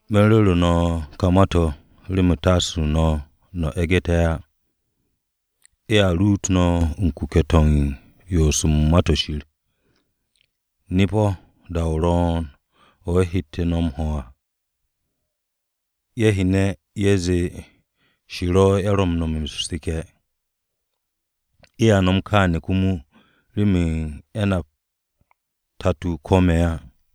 “Me̱n ru̱ru̱ no̱ ka ma-to̱ remen taase no̱ no̱ e̱gé̱ á. Ye̱a ruut no̱ u̱n kuke̱-to̱ u̱n yoos u̱n Ma-to̱ Shir. Nip-o̱ da-o ro̱o̱n o̱ ye̱ hette̱ no̱ m-ho̱ à, ye̱ hyene̱ ye̱ zee Shir-o̱ ye̱ ro̱ m-no̱me̱ u̱r-seke̱. Ye̱a nom kááne̱ komo remen ye̱ nap o-Tato ko̱ me̱ á.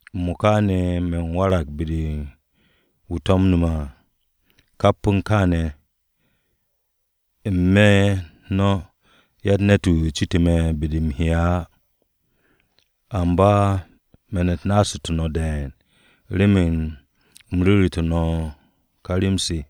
M-mo̱ka ne̱, me̱n warag be-de u̱n wu̱ to̱mne̱ me̱ à. Kap u̱n kááne̱ ne̱, n-me̱ u̱n no̱ yatt ne̱t-wu̱ citu̱ me̱ be-de u̱m he'e̱ á. Amba me̱n-u̱t naasu̱tu̱ no̱ de̱e̱n remen u̱m ru̱ru̱te̱ no̱ ka rem-se.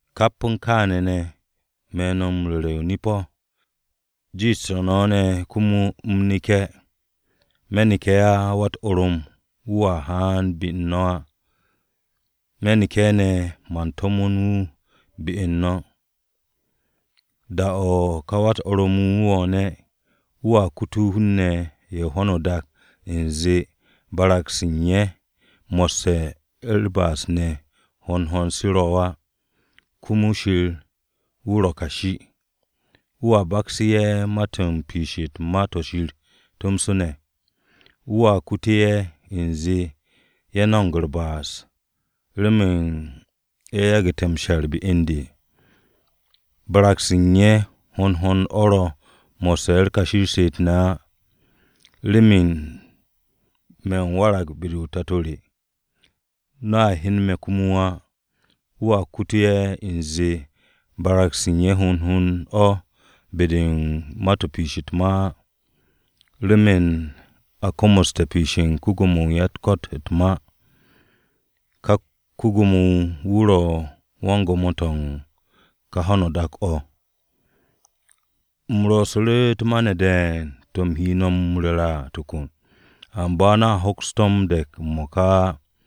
Kap u̱n kááne̱ ne̱, me̱ no̱ m-ru̱re̱, nip-o̱: jiishte̱ no̱ ne̱ komo u̱m neke̱. Me̱ neke̱ á, ka Wa-u̱t-Orom wu̱ a haan be-u̱r no̱ á. Me̱ neke̱ ne̱, man to̱mo̱n wu̱ be u̱n no̱. Da-o̱ ka Wa-u̱t-Orom wu̱ haane̱, wu̱a kute̱ hun-ne̱ ye̱ ho̱no o-dak u̱nze barag-se u̱n ye̱ mo̱sse̱ u̱r-ba'as ne̱ hond hond se ro̱ á. Komo Shir wu̱ ro̱ kashi. Wu̱a baksu̱ ye̱ ma-to̱ u̱n piish u̱t-ma to̱ Shir tomso ne̱. Wu̱a kutu̱ ye̱ u̱nze ye̱ no̱mo̱g u̱r-ba'as remen ye̱ yagu̱te̱ m-she̱r be u̱n de. Barag-se u̱n ye̱ hond hond o̱ se ro̱ mo̱sse̱ u̱n kashi u̱r-she'et ne̱ á, remen me̱ m-warag be-u̱r Tato re. No̱a hyen me̱ komo á. Wu̱a kute̱ ye̱ u̱nze barag-se u̱n ye̱ hond hond o̱ be-de u̱n ma-to̱ u̱n piish u̱t-ma á, remen a komoste̱ piishe̱ u̱n ko-Gwo̱mo-wu̱ u̱n ya-u̱t-ko̱t u̱t-ma. Ka ko-Gwo̱mo-wu̱ wu̱ ro̱ wan-gwo̱mo to̱ u̱n ka ho̱no o-dak o̱. “U̱m ro̱'su̱ru̱ u̱t-ma ne̱ de̱e̱n to̱ u̱m he no̱ m-ru̱re̱ à tokon, amba no̱a hoks to̱ m-de̱k m-mo̱ka á.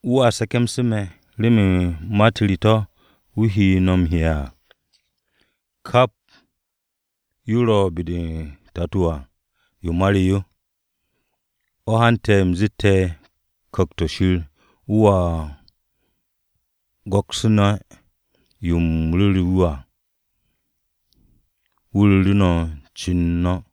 Wu̱a se̱ke̱mse̱ me̱, remen ma-u̱t re to̱ wu̱ he no̱ m-hi'e̱ à. Kap yo ro̱ be-de o-Tato à, yo ma re yo. O̱ hante̱ u̱m zeet Ku̱kt-o̱ Shir wu̱a go̱ksu̱ne̱ yo u̱m ru̱ru̱ wu̱ à, wu̱ ru̱ru̱ no̱ u̱n ce no̱.”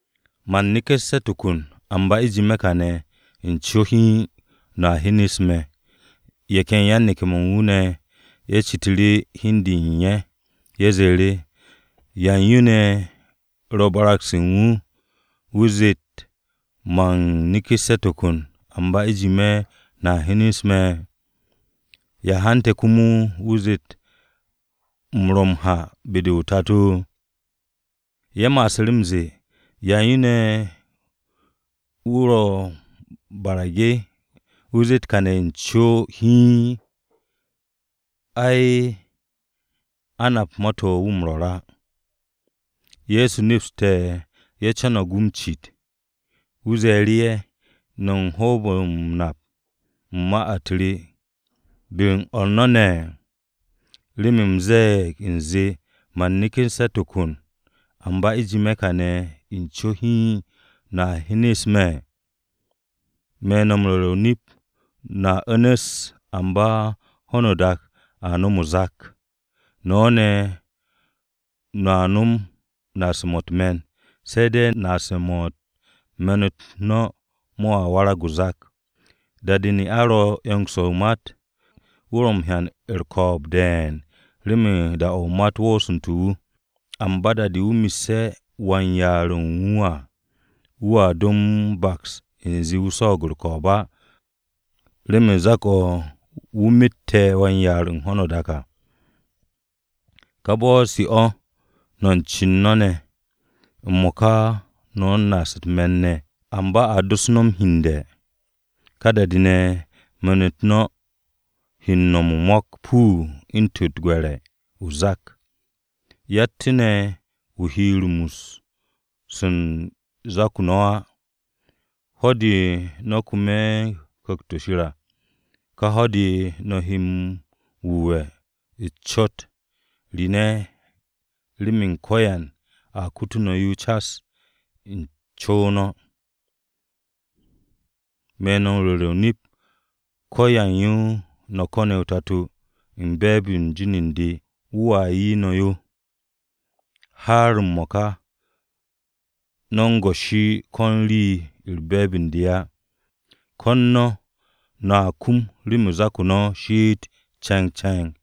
“Man neku̱sse̱ tokon, amba u̱jime̱ kane̱ u̱n co hiin no̱a hyenes me̱.” Ye̱ ken yan-neke̱-mo̱ u̱n wu̱ ne̱ ye̱ citu̱ru̱ hi u̱n de u̱n ye̱, ye̱ zee, “¿Yan yo ne̱ ro̱ barag-se u̱n wu̱, wu̱ zeet, ‘Man neku̱sse̱ tokon, amba u̱jime̱ no̱a hyenes me̱’? ¿Ya hante̱ komo wu̱ zeet u̱m ro̱ m-ha be-de o-Tato?” Ye̱ ma'asu̱ru̱ m-ze̱e̱, “¿Yan yo ne̱ wu̱ barage̱ wu̱ zeet kane̱ u̱n co hiin? Ay, a nap ma-to̱ wu̱ ro̱ m-rwo̱r á.” Ye̱so nepste̱ ye̱ co̱no̱g wu̱ m-cit, wu̱ ze̱e̱ru̱ ye̱, “¿No̱ o̱ hoob-o̱ m-nap u̱n ma-u̱t re be-u̱r o̱r no̱ ne̱ remen u̱m ze̱e̱g u̱nze, ‘Man neku̱sse̱ tokon amba u̱jime̱ kane̱ u̱n co hiin no̱a hyenes me̱’? Me̱ no̱ m-ru̱re̱ o-nip, no̱a u̱nu̱s, amba ho̱no o-dak a nom o-zak. No̱ ne̱, no̱a nom naase̱-mo̱ u̱t-me̱n, se̱ de̱ naase̱-mo̱ u̱n me̱n-u̱t no̱ mo̱a warag o-zak. Da-de ne'a ro u̱n 'yong-se o-mat, wu̱ ro̱ u̱n hyan u̱r-ko̱o̱b de̱e̱n remen da-o̱ o-mat woosu̱nte̱ wu̱. Amba da-de wu̱ messe̱ wan-yaar-wu̱ u̱n wu̱ à, wu̱a do m-baks u̱nze wu̱ swo̱o̱g u̱r-ko̱o̱b á, remen o-zak o̱ wu̱ mette̱ wan-yaar u̱n ho̱no o-dak à. Ka bo̱-se o̱, no̱ u̱n cen no̱ ne̱, m-mo̱ka no̱ u̱n naase̱-mo̱ u̱t-me̱n ne̱. Amba a dos no̱ m-hyende̱. Ka da-de ne̱ o̱ me̱n-u̱t no̱ he no̱m o-mo̱k puu u̱ntu̱n u̱t-gwe̱re̱ o-zak. Yattu̱ ne̱ wu̱ he rumus u̱n zak-o no̱ á. Ho̱-de no̱ he kum u̱n Ku̱kt-o̱ Shir à, ka ho̱-de ne̱ no̱ he m-wu̱we̱ u̱n cot-u̱s re ne̱ remen ko̱yan a kutu̱ no̱ yo cas u̱n co-o no̱. Me̱ no̱ m-ru̱re̱ o-nip, ko̱yan yo no̱ ko̱ne̱ o-Tato u̱n be̱e̱b-de u̱n jin u̱n de, wu̱a 'ye no̱ yo. Har m-mo̱ka no̱ u̱n goshi ko̱n rii u̱n be̱e̱b u̱n de á. Ko̱n no̱, no̱a kum remen zak-o no̱ shiit ce̱ngce̱ng.”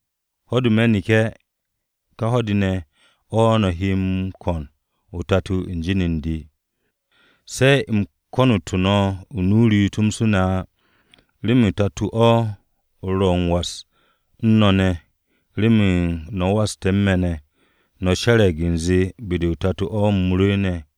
Ho̱-de me̱ neke̱, ka ho̱-de ne̱ o̱ no̱ he m-ko̱n o-Tato u̱n jin u̱n de. Se̱ u̱m konu̱tu̱ no̱ u̱n nu-o re tomso ne̱ á, remen Tato-o ro̱ u̱n was u̱n no̱ ne̱ remen no̱ waste̱ u̱n me̱ ne̱, no̱ she̱re̱g u̱nze be-de o-Tato o̱ u̱m rwu̱u̱ne̱.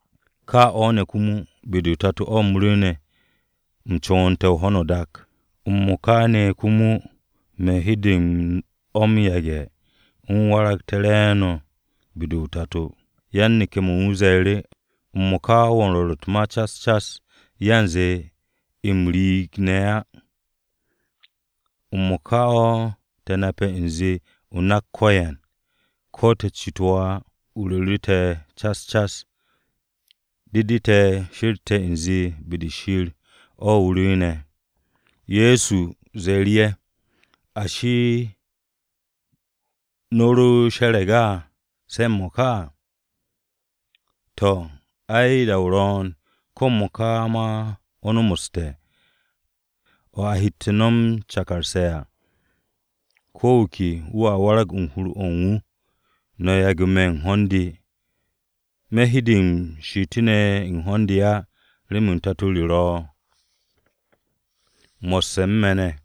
Ka o̱ ne̱ komo, be-de o-Tato u̱m rwu̱u̱ne̱, u̱m co̱wo̱nte̱ ho̱no o-dak. M-mo̱ka ne̱ komo me̱ u̱n hede o̱ m-yage̱ u̱m waragté̱ re̱e̱no̱ be-de o-Tato.” Yan-neke̱-mo̱ u̱n wu̱ ze̱e̱ru̱, “M-mo̱ka wo̱ u̱n rwo̱r u̱t-ma cas cas, yanze m-riig ne̱ á. M-mo̱ka o̱ te̱ nape̱ u̱nze o nak ko̱yan, ko̱ te̱ citu̱ wo̱ á, o ru̱ru̱tu̱ te̱ cas cas. De de te̱ she̱rte̱ u̱nze be-de Shir-o̱ o rwu̱u̱ne̱.” Ye̱so ze̱e̱ru̱ ye̱, “Ashi, no̱ ro she̱re̱g á, se̱ m-mo̱ka! To̱, ai, da-o ro̱o̱n, ko̱ m-mo̱ka ma o̱ nomoste̱, o̱ a hette̱ no̱ m-cakarse̱ à. Ko̱ wu̱ ke wu̱a warag u̱n hur-o̱ u̱n wu̱, no̱ yage̱ me̱ u̱n ho̱n-de. Me̱ hede m-she'etu̱ ne̱ u̱n ho̱n-de á, remen Tato re ro̱ mo̱sse̱ u̱n me̱ ne̱.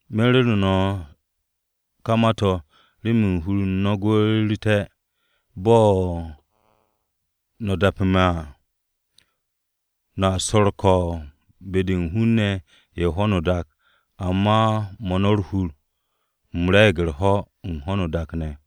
Me̱ u̱n ru̱ru̱ no̱ ka ma-to̱ remen hur u̱n no̱ gwu̱'u̱ru̱té̱ bo̱ no̱ dape̱ me̱ à. No̱a su̱ u̱r-ko̱o̱b be-de u̱n hun-ne̱ ye̱ u̱n ho̱no o-dak amba 'mo̱ no̱ u̱r-hur! U̱m re̱e̱g u̱r-ho̱ u̱n ho̱no o-dak ne̱!”